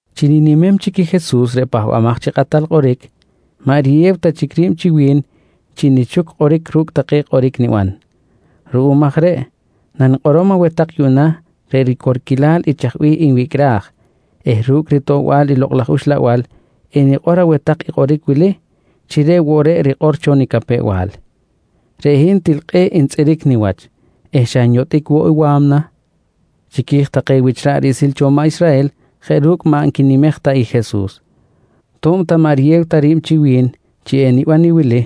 Chi ninimem chic i Jesus reꞌ Pahbamaj chi Kꞌatal Kꞌoric, maꞌ riyew ta chic ri̱b chi wi̱n chi nichuc kꞌoric ru̱cꞌ take kꞌoric niban. Ruꞌum aj reꞌ nanikꞌorom aweh tak yuꞌna reꞌ ricorquilal i chaj bih nwicꞌraj eh ru̱cꞌ ritoꞌbal i Lokꞌ laj Uxlabal enikꞌor aweh tak i kꞌoric wili chi reꞌ woꞌ reꞌ rikꞌor cho nicapew-bal: Reꞌ hin til kꞌe̱ꞌ ntzꞌiric niwach eh xa nyotꞌic woꞌ wa̱mna chiqui̱j take wich ra̱ꞌ riꞌsil cho maꞌ Israhel jeꞌ ru̱cꞌ maꞌ nquinimej ta i Jesus. To̱b ta maꞌ riyew ta ri̱b chi wi̱n chi eniban i wili: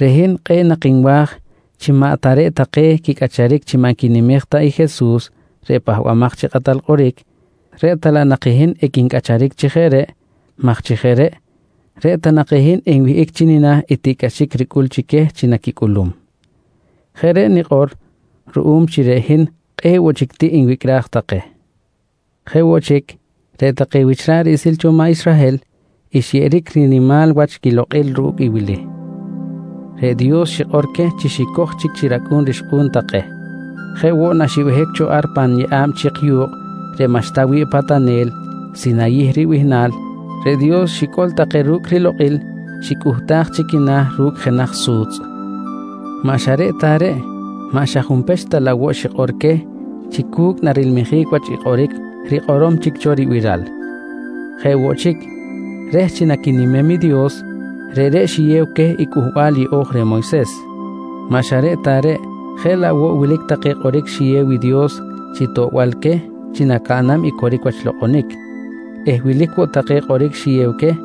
Reꞌ hin kꞌe̱ꞌ nak nwa̱j chi maꞌ ta reꞌ take reꞌ quicꞌacharic chi maꞌ nquinimej ta i Jesus reꞌ Pahbamaj chi Kꞌatal Kꞌoric, reꞌ ta laꞌ nak i hin equincꞌacharic chi jeꞌ reꞌ maj chi jeꞌ reꞌ, reꞌ ta nak i hin enwihꞌic chi nina̱ i tiꞌcꞌaxic ricꞌul chi queh chi naquicꞌulum. Jeꞌ reꞌ nikꞌor ruꞌum chi reꞌ hin kꞌe̱ꞌ woꞌ chic tiꞌ nwicꞌraj take. Jeꞌ woꞌ chic, reꞌ take wich ra̱ꞌ riꞌsil cho maꞌ Israhel xyeꞌeric rinimal wach quilokꞌil ru̱cꞌ i wili: Reꞌ Dios xikꞌor queh chi xicoj chic chi racꞌu̱n rixkꞌu̱n take. Jeꞌ woꞌ naxibehic cho ar pan yeꞌa̱b chik yu̱kꞌ reꞌ maꞌxta wi̱ꞌ patanel Sinayih ribihnal, reꞌ Dios xicꞌol take ru̱cꞌ rilokꞌil xicꞌuhtaj chi quina̱ ru̱cꞌ jenaj su̱tzꞌ. Maꞌ xa reꞌ ta reꞌ, maꞌ xa junpech ta laꞌ woꞌ xikꞌor queh chi cu̱cꞌ narimanlajic wach i kꞌoric rikꞌorom chic cho ribiral. Jeꞌ woꞌ chic, reh chi naquinimem i Dios reꞌreꞌ xiyew queh i Cꞌuhbal Yeꞌo̱j reh Moyses. Maꞌ xa reꞌ ta reꞌ, jeꞌ laꞌ woꞌ wilic take kꞌoric xiyew i Dios chi toꞌbal queh chi nacaꞌnam i coric wach lokꞌonic eh wilic woꞌ take kꞌoric xiyew queh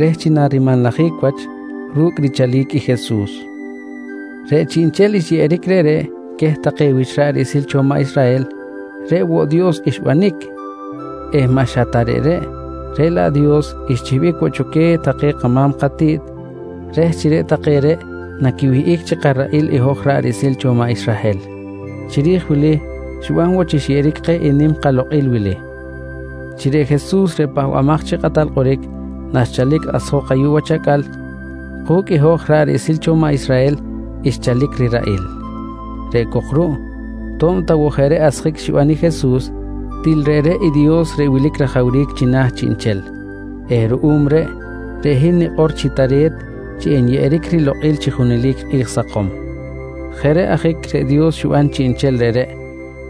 reh chi narimanlajic wach ru̱cꞌ richalic i Jesus. Reꞌ chiꞌnchel xyeꞌeric reꞌreꞌ queh take wich ra̱ꞌ riꞌsil cho maꞌ Israhel reꞌ woꞌ Dios xbanic eh maꞌ xa ta reꞌreꞌ, reꞌ laꞌ Dios xchihbic woꞌ cho queh take kama̱m katiꞌt reh chi reꞌ take reꞌ naquiwihꞌic chi karaꞌil i hoj ra̱ꞌ riꞌsil cho maꞌ Israhel. Chiri̱j wili xiban woꞌ chi xyeꞌeric keh i nim kalokꞌil wili: Chi reꞌ Jesus reꞌ Pahbamaj chi Kꞌatal Kꞌoric naxchalic asjok ayuꞌ wach acꞌal ku̱cꞌ i hoj ra̱ꞌ riꞌsil cho maꞌ Israhel xchalic riraꞌil. Reꞌ cok ruꞌ to̱b ta woꞌ jeꞌ reꞌ asjic xiban i Jesus, til reꞌreꞌ i Dios reꞌ wilic rajawric china̱ chiꞌnchel eh ruꞌum reꞌ, reꞌ hin nikꞌor chi tare̱t chi enyeꞌeric rilokꞌil chi junelic kꞌi̱j sakom. Jeꞌ reꞌ ajic reꞌ Dios xiban chiꞌnchel reꞌreꞌ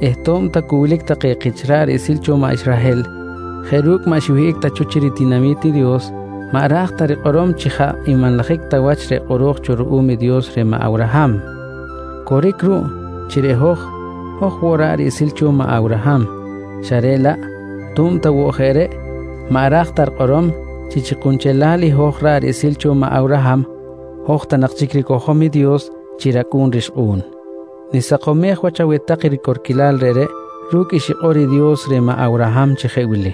eh to̱b ta cu wilic take kich ra̱ꞌ riꞌsil cho maꞌ Israhel jeꞌ ru̱cꞌ maꞌ xiwihꞌic ta cho chi ritinami̱t i Dios maꞌ ra̱j ta rikꞌorom chi jaꞌ nmanlajic ta wach reꞌ kꞌoro̱j cho ruꞌum i Dios reh maꞌ Awraham. Coric ruꞌ chi reꞌ hoj, hoj woꞌ ra̱ꞌ riꞌsil cho maꞌ Awraham xa reꞌ laꞌ to̱b ta woꞌ jeꞌ reꞌ maꞌ ra̱j ta rikꞌorom chi, chi kunchelal i hoj ra̱ꞌ riꞌsil cho maꞌ Awraham hoj ta nak chic ricojom i Dios chi racꞌu̱n rixkꞌu̱n. Nisakomej wach aweh tak i ricorquilal reꞌreꞌ ru̱cꞌ i xikꞌor i Dios reh maꞌ Awraham chi jeꞌ wili: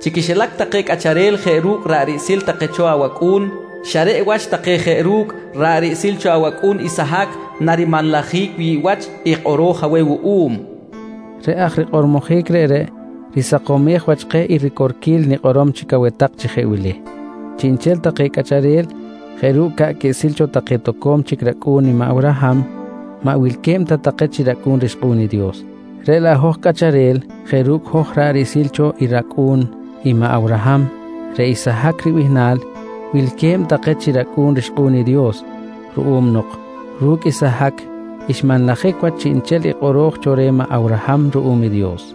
“Chi quixilac take cꞌacharel jeꞌ ru̱cꞌ ra̱ꞌ riꞌsil cho take awacꞌu̱n, xa reꞌ wach take jeꞌ ru̱cꞌ ra̱ꞌ riꞌsil cho awacꞌu̱n Isahac narimanlajic wi̱ꞌ wach i kꞌoro̱j aweh wuꞌum, nqui Dios reh. Reꞌ aj rikꞌormojic reꞌreꞌ risakomej wach keh i ricorquil nikꞌorom chic aweh tak chi jeꞌ wili: Chiꞌnchel take cꞌacharel jeꞌ ru̱cꞌ ca̱ꞌ quiꞌsil cho take toco̱m chic racꞌu̱n i maꞌ Awraham maꞌ wilque̱b ta take chi racꞌu̱n rixkꞌu̱n i Dios, reꞌ laꞌ hoj cꞌacharel jeꞌ ru̱cꞌ hoj ra̱ꞌ riꞌsil cho i racꞌu̱n i maꞌ Awraham reꞌ Isahac ribihnal wilque̱b take chi racꞌu̱n rixkꞌu̱n i Dios, ruꞌum nok ru̱cꞌ Isahac xmanlajic wach chiꞌnchel i kꞌoro̱j cho reh maꞌ Awraham ruꞌum i Dios.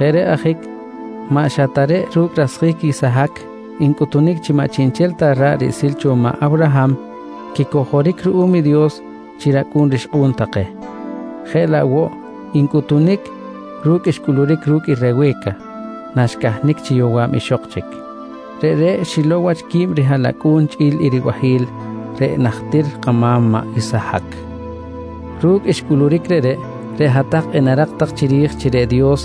Jeꞌ reꞌ ajic maꞌ xa ta reꞌ ru̱cꞌ rasjic Isahac ncꞌuhtunic chi maꞌ chiꞌnchel ta ra̱ꞌ riꞌsil cho maꞌ Awraham quicojoric ruꞌum i Dios chi racꞌu̱n rixkꞌu̱n take, jeꞌ laꞌ woꞌ ncꞌuhtunic ru̱cꞌ xcꞌuluric ru̱cꞌ i Rewe̱ca naxcahnic chi yowa̱b ixok chic. Reꞌreꞌ xilow wach quib rihaꞌlacꞌu̱n chꞌi̱l i ribahi̱l reꞌ najtir kama̱m maꞌ Isahac. Ru̱cꞌ xcꞌuluric reꞌreꞌ, reꞌ hat-tak enarak tak chiri̱j chi reꞌ Dios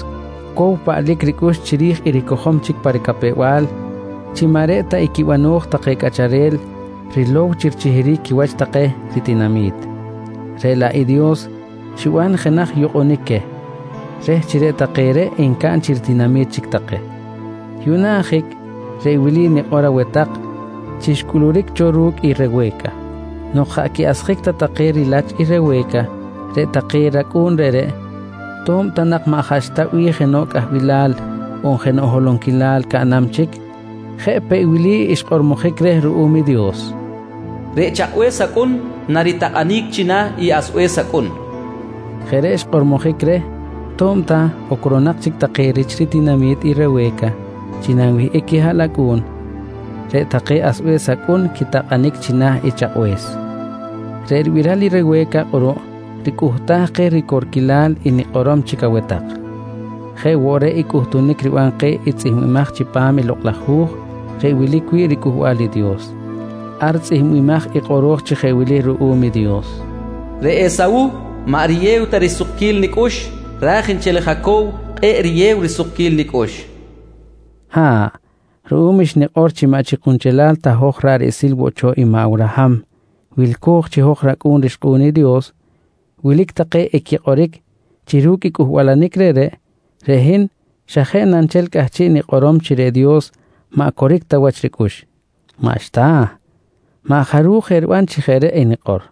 cow paꞌlic ricꞌux chiri̱j i ricojom chic pa ricapew-bal chi maꞌ reꞌ ta i quibano̱j take cꞌacharel rilow chi richihiric quiwach take ritinami̱t, reꞌ laꞌ i Dios xiban jenaj yukꞌunic queh, reh chi reꞌ take reꞌ encaꞌn chi ritinami̱t chic take. Yuꞌna ajic reꞌ wili nikꞌor aweh tak chi xcꞌuluric cho ru̱cꞌ i Rewe̱ca: Nok jaꞌ quiꞌasjic ta take rilach i Rewe̱ca, reꞌ take racꞌu̱n reꞌreꞌ to̱b ta nak maꞌ jaꞌxta bih jenoꞌ cꞌahbilal on jenoꞌ holonquilal caꞌnam chic, jeꞌ peꞌ je wili xkꞌormojic reh ruꞌum i Dios: “Reꞌ chakꞌbe̱s acꞌun naritakꞌanic china̱ i asbe̱s acꞌun, nqui xkꞌormojic reh. Jeꞌ reꞌ xkꞌormojic reh to̱b ta ocronak chic take rich ritinami̱t i Rewe̱ca chi nanwihꞌic quihaꞌlacꞌu̱n, reꞌ take asbe̱s acꞌun quitakꞌanic china̱ i chakꞌbe̱s. Reꞌ ribiral i Rewe̱ca kꞌuruꞌ ricꞌuhtaj keh ricorquilal i nikꞌorom chic aweh tak. Jeꞌ woꞌ reꞌ i cꞌuhtunic riban keh i tzꞌihmbimaj chipam i Lokꞌ laj Hu̱j reꞌ wilic wi̱ꞌ riCꞌuhbal i Dios. Ar tzꞌihmbimaj i kꞌoro̱j chi jeꞌ wili ruꞌum i Dios: “Reꞌ Esawuh maꞌ riyew ta risukquil nicꞌux ra̱j nchel i Jacow kꞌe̱ꞌ riyew risukquil nicꞌux, nqui rikꞌor. Ha̱ꞌ, ruꞌum xnikꞌor chi maꞌ chi kunchelal ta hoj ra̱ꞌ riꞌsil woꞌ cho i maꞌ Awraham wilco̱j chi hoj racꞌu̱n rixkꞌu̱n i Dios, wilic take equikꞌoric chi ru̱cꞌ i cꞌuhbalanic reꞌreꞌ, reꞌ hin xa jeꞌ na nchel cꞌahchiꞌ nikꞌorom chi reꞌ Dios maꞌ coric ta wach ricꞌux. Maꞌxta, maꞌ jaruj eriban chi jeꞌ reꞌ enikꞌor.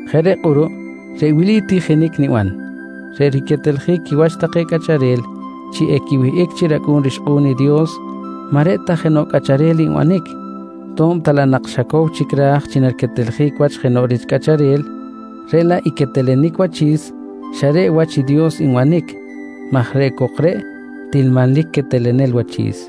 Jeꞌ reꞌ kꞌuruꞌ reꞌ wili tijinic niban: Reꞌ riqueteljic quiwach take cꞌacharel chi equiwihꞌic chi racꞌu̱n rixkꞌu̱n i Dios maꞌ reꞌ ta jenoꞌ cꞌacharel nbanic to̱b ta laꞌ nak xa cow chic ra̱j chi nariqueteljic wach jenoꞌ chic rich cꞌacharel, reꞌ laꞌ i quetelenic wachi̱s xa reꞌ wach Dios nbanic maj reꞌ cok reꞌ til manlic quetelenel wachi̱s.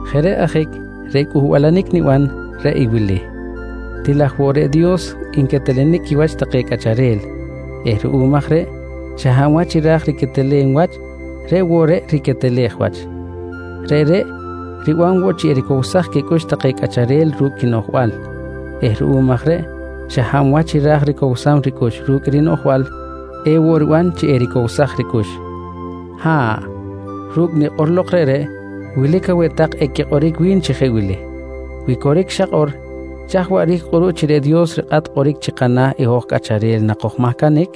Jeꞌ reꞌ ajic reꞌ cꞌuhbalanic niban reꞌ i wili: Til aj woꞌ reꞌ Dios nquetelenic quiwach take cꞌacharel eh ruꞌum aj reꞌ xa hab wach i ra̱j riquetelem wach, reꞌ woꞌ reꞌ riquetelej wach. Reꞌreꞌ riban woꞌ chi ericowsaj quicꞌux take cꞌacharel ru̱cꞌ quinoꞌjbal eh ruꞌum aj reꞌ xa hab wach i ra̱j ricowsam ricꞌux ru̱cꞌ i rinoꞌjbal, ewoꞌ riban chi ericowsaj ricꞌux. Ha̱ꞌ, ru̱cꞌ nikꞌor lok reꞌreꞌ, wilic aweh tak equikꞌoric wi̱n chi jeꞌ wili: «Wi coric xakꞌor, chaj waꞌric kꞌuruꞌ chi reꞌ Dios rikꞌat kꞌoric chi kana̱ i hoj cꞌacharel nakojmahcanic?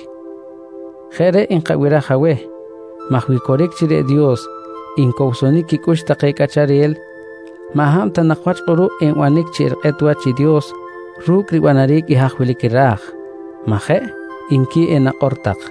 Jeꞌ reꞌ nkabiraj aweh maj wi coric chi reꞌ Dios ncowsonic quicꞌux take cꞌacharel, maꞌ hab ta wach kꞌuruꞌ enbanic chi erikꞌet wach i Dios ru̱cꞌ ribanaric i haj wilic i ra̱j, majeꞌ? nqui enakꞌor tak.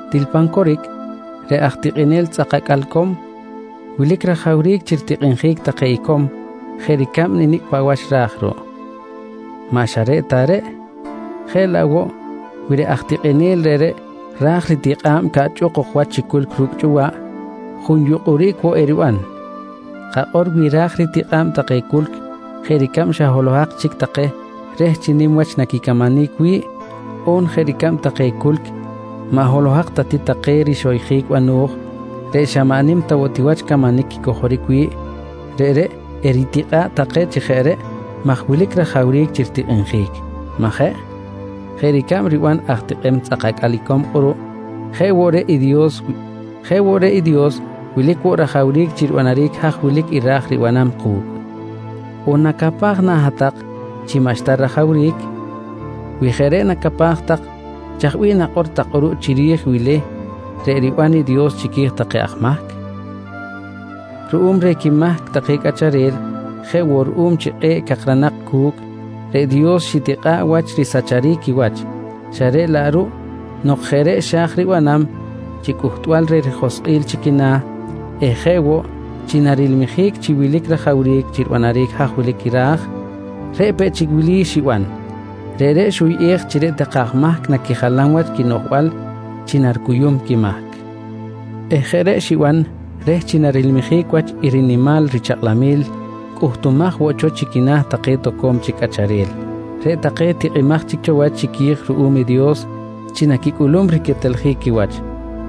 Til pan coric reꞌ aj tikꞌinel tzꞌak acꞌal icom wilic rajawric chi ritikꞌinjic take icom jeꞌ ricab nicꞌ paꞌ wach ra̱j ruꞌ. Maꞌ xa reꞌ ta reꞌ, jeꞌ laꞌ woꞌ wi reꞌ aj tikꞌinel reꞌreꞌ ra̱j ritikꞌa̱b caꞌchꞌuk ok wach chi culc ru̱cꞌ chꞌuwaꞌ, junyukꞌuric woꞌ eriban. Kakꞌor wi ra̱j ritikꞌa̱b take culc jeꞌ ricab xa holohak chic take reh chi nim wach naquicamanic wi̱ꞌ, on jeꞌ ricab take culc maꞌ holohak ta ti take rixoyjic bano̱j reꞌ xa maꞌ nim ta woꞌ wach camanic quicojoric wi̱ꞌ, reꞌreꞌ eritikꞌa̱ꞌ take chi jeꞌ reꞌ maj wilic rajawric chi ritikꞌinjic, majeꞌ? Jeꞌ ricab riban aj tikꞌem tzꞌak acꞌal icom kꞌuruꞌ, jeꞌ woꞌ reꞌ i Dios wilic woꞌ rajawric chi ribanaric haj wilic i ra̱j ribanam ku̱cꞌ. On nacapaj na hat-tak chi maꞌxta rajawric? Wi jeꞌ reꞌ nacapaj tak, chaj bih nakꞌor tak kꞌuruꞌ chiri̱j i wili reꞌ riban i Dios chiqui̱j take aj mahc? Ruꞌum reh quimahc take cꞌacharel jeꞌ woꞌ ruꞌum chi kꞌe̱ꞌ cakranak cu̱cꞌ, reꞌ Dios xitikꞌa̱ꞌ wach risacharic quiwach xa reꞌ laꞌ ruꞌ nok jeꞌ reꞌ xa̱j ribanam chi cꞌuhtbal reh rijoskꞌil chi quina̱ eh jeꞌ woꞌ chi narilmijic chi wilic rajawric chi ribanaric haj wilic i ra̱j, reꞌ peꞌ chic i wili xiban: Reꞌreꞌ xuyꞌej chi reꞌ take aj mahc naquijalam wach quinoꞌjbal chi naricuyum quimahc eh jeꞌ reꞌ xiban reh chi narilmijic wach i rinimal richakꞌlamil cꞌuhtumaj woꞌ cho chi quina̱ take toco̱m chic cꞌacharel, reꞌ take tikꞌimaj chic cho wach chiqui̱j ruꞌum i Dios chi naquicꞌulum riqueteljic quiwach,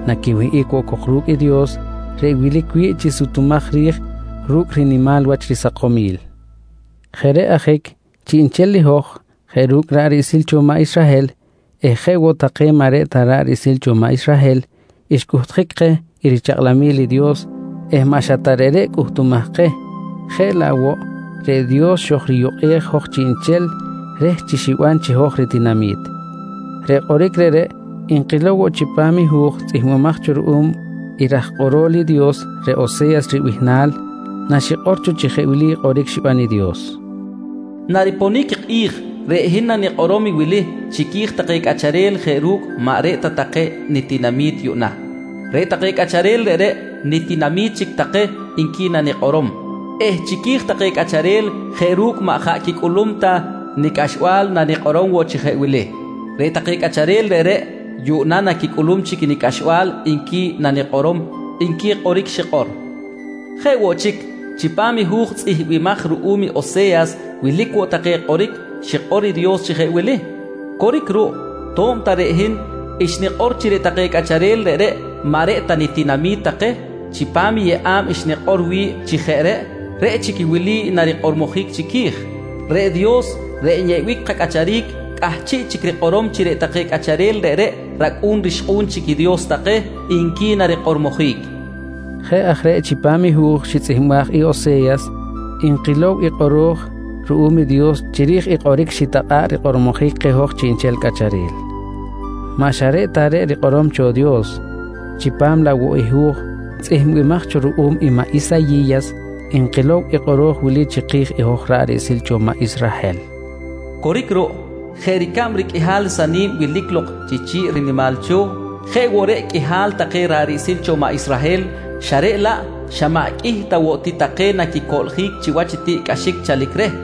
naquiwihꞌic woꞌ ru̱cꞌ i Dios reꞌ wilic wi̱ꞌ chi sutumaj ri̱j ru̱cꞌ rinimal wach risakomil. Jeꞌ reꞌ ajic chiꞌnchel i hoj jeꞌ ru̱cꞌ ra̱ꞌ riꞌsil cho maꞌ Israhel eh jeꞌ woꞌ take maꞌ reꞌ ta ra̱ꞌ riꞌsil cho maꞌ Israhel, xcꞌuhtjic keh i richakꞌlamil i Dios eh maꞌ xa ta reꞌreꞌ cꞌuhtumaj keh, jeꞌ laꞌ woꞌ, reꞌ Dios xojriyukꞌej hoj chiꞌnchel reh chi xiban chi hoj ritinami̱t. Reꞌ kꞌoric reꞌreꞌ nkilow woꞌ chipam i hu̱j tzꞌihmbimaj cho ruꞌum i raj kꞌorol i Dios reꞌ Ose̱yas ribihnal naxikꞌor cho chi jeꞌ wili kꞌoric xiban i Dios: “Nariponic i kꞌi̱j reꞌ hin nanikꞌorom i wili chiqui̱j take cꞌacharel jeꞌ ru̱cꞌ maꞌ reꞌ ta take nitinami̱t yuꞌna: ‘Reꞌ take cꞌacharel reꞌreꞌ nitinami̱t chic take, nqui nanikꞌorom. Eh chiqui̱j take cꞌacharel jeꞌ ru̱cꞌ maꞌ jaꞌ quicꞌulum ta nicꞌaxbal nanikꞌorom woꞌ chi jeꞌ wili: ‘Reꞌ take cꞌacharel reꞌreꞌ, yuꞌna naquicꞌulum chic i nicꞌaxbal, nqui nanikꞌorom, nqui kꞌoric xikꞌor. Jeꞌ woꞌ chic, chipam i hu̱j tzꞌihmbimaj ruꞌum i Ose̱yas wilic woꞌ take kꞌoric xikꞌor i Dios chi jeꞌ wili: “Coric ruꞌ, to̱b ta reꞌ hin xnikꞌor chi reꞌ take cꞌacharel reꞌreꞌ maꞌ reꞌ ta nitinami̱t take, chipam i yeꞌa̱b xnikꞌor wi̱ꞌ chi jeꞌ reꞌ, reꞌ chic i wili narikꞌormojic chiqui̱j: ‘Reꞌ Dios reꞌ nyeꞌbic kacꞌacharic cꞌahchiꞌ chic rikꞌorom chi reꞌ take cꞌacharel reꞌreꞌ racꞌu̱n rixkꞌu̱n chic i Dios take, nqui narikꞌormojic, nqui kꞌoro̱j cho ruꞌum i Dios. Jeꞌ aj reꞌ chipam i hu̱j xitzꞌihmbaj i Ose̱yas nkilow i kꞌoro̱j ruꞌum i Dios chiri̱j i kꞌoric xitakꞌa̱ꞌ rikꞌormojic keh hoj chiꞌnchel cꞌacharel. Maꞌ xa reꞌ ta reꞌ rikꞌorom cho i Dios, chipam laꞌ woꞌ i hu̱j tzꞌihmbimaj cho ruꞌum i maꞌ Isayi̱yas nkilow i kꞌoro̱j wili chiki̱j i hoj ra̱ꞌ riꞌsil cho maꞌ Israhel: “Coric ruꞌ, jeꞌ ricab riqꞌuihal i sani̱b wilic lok chi chi̱ꞌ rinimal cho̱, jeꞌ woꞌ reꞌ qꞌuihal take ra̱ꞌ riꞌsil cho maꞌ Israhel xa reꞌ laꞌ xa maꞌ qꞌuih ta woꞌ ti take naquicoꞌljic chiwach i tiꞌcꞌaxic chalic reh.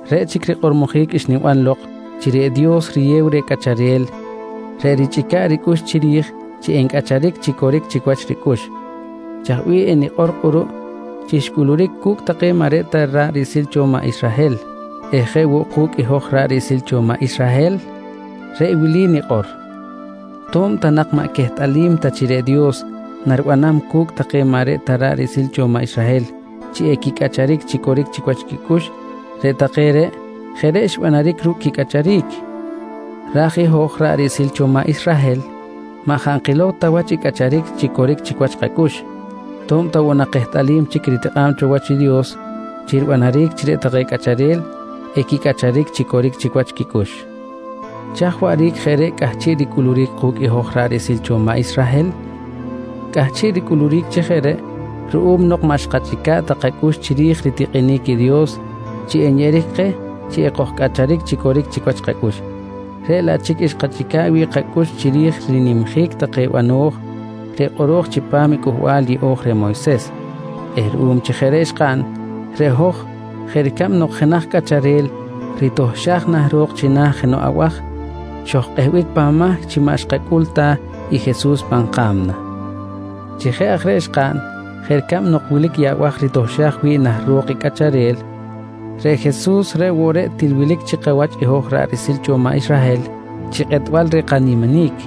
Reꞌ chic i rikꞌormojic xniban lok chi reꞌ Dios riyew reh cꞌacharel reꞌ richꞌica̱ꞌ ricꞌux chiri̱j chi encꞌacharic chi coric chic wach ricꞌux, chaj bih enikꞌor kꞌuruꞌ chi xcꞌuluric cu̱cꞌ take maꞌ reꞌ ta ra̱ꞌ riꞌsil cho maꞌ Israhel eh jeꞌ woꞌ ku̱cꞌ i hoj ra̱ꞌ riꞌsil cho maꞌ Israhel? Reꞌ wili nikꞌor: To̱b ta nak maꞌ quehtꞌalim ta chi reꞌ Dios naribanam cu̱cꞌ take maꞌ reꞌ ta ra̱ꞌ riꞌsil cho maꞌ Israhel chi equicꞌacharic chi coric chic wach quicꞌux, reꞌ take reꞌ jeꞌ reꞌ xbanaric ru̱cꞌ quicꞌacharic, ra̱j i hoj ra̱ꞌ riꞌsil cho maꞌ Israhel maꞌ jaꞌ nkilow ta wach i cꞌacharic chi coric chic wach kacꞌux to̱b ta woꞌ nak kehtꞌalim chic i ritikꞌa̱b cho wach i Dios chi ribanaric chi reꞌ take cꞌacharel equicꞌacharic chi coric chic wach quicꞌux. Chaj waꞌric jeꞌ reꞌ cꞌahchiꞌ ricꞌuluric ku̱cꞌ hoj ra̱ꞌ riꞌsil cho maꞌ Israhel? Cꞌahchiꞌ ricꞌuluric chi jeꞌ reꞌ ruꞌum nok maꞌ xkachꞌica̱ꞌ ta kacꞌux chiri̱j ritikꞌinic i Dios chi nyeꞌeric keh chi ekojcꞌacharic chi coric chic wach kacꞌux, reꞌ laꞌ chic xkachꞌica̱ꞌ wi̱ꞌ kacꞌux chiri̱j rinimjic take bano̱j reꞌ kꞌoro̱j chipam i Cꞌuhbal Yeꞌo̱j reh Moyses eh ruꞌum chi jeꞌ reꞌ xkaꞌn, reꞌ hoj jeꞌ ricab nok jenaj cꞌacharel ritohxaj nah ro̱k china̱ jenoꞌ abaj, xojkꞌehbic pan mahc chi maꞌ xkacꞌul ta i Jesus pan ka̱mna. Chi jeꞌ aj reꞌ xkaꞌn jeꞌ ricab nok wilic i abaj ritohxaj wi̱ꞌ nah ro̱k i cꞌacharel, reꞌ Jesus reꞌ woꞌ reꞌ til wilic chi kawach hoj ra̱ꞌ riꞌsil cho maꞌ Israhel chi kꞌetbal reh kaniminic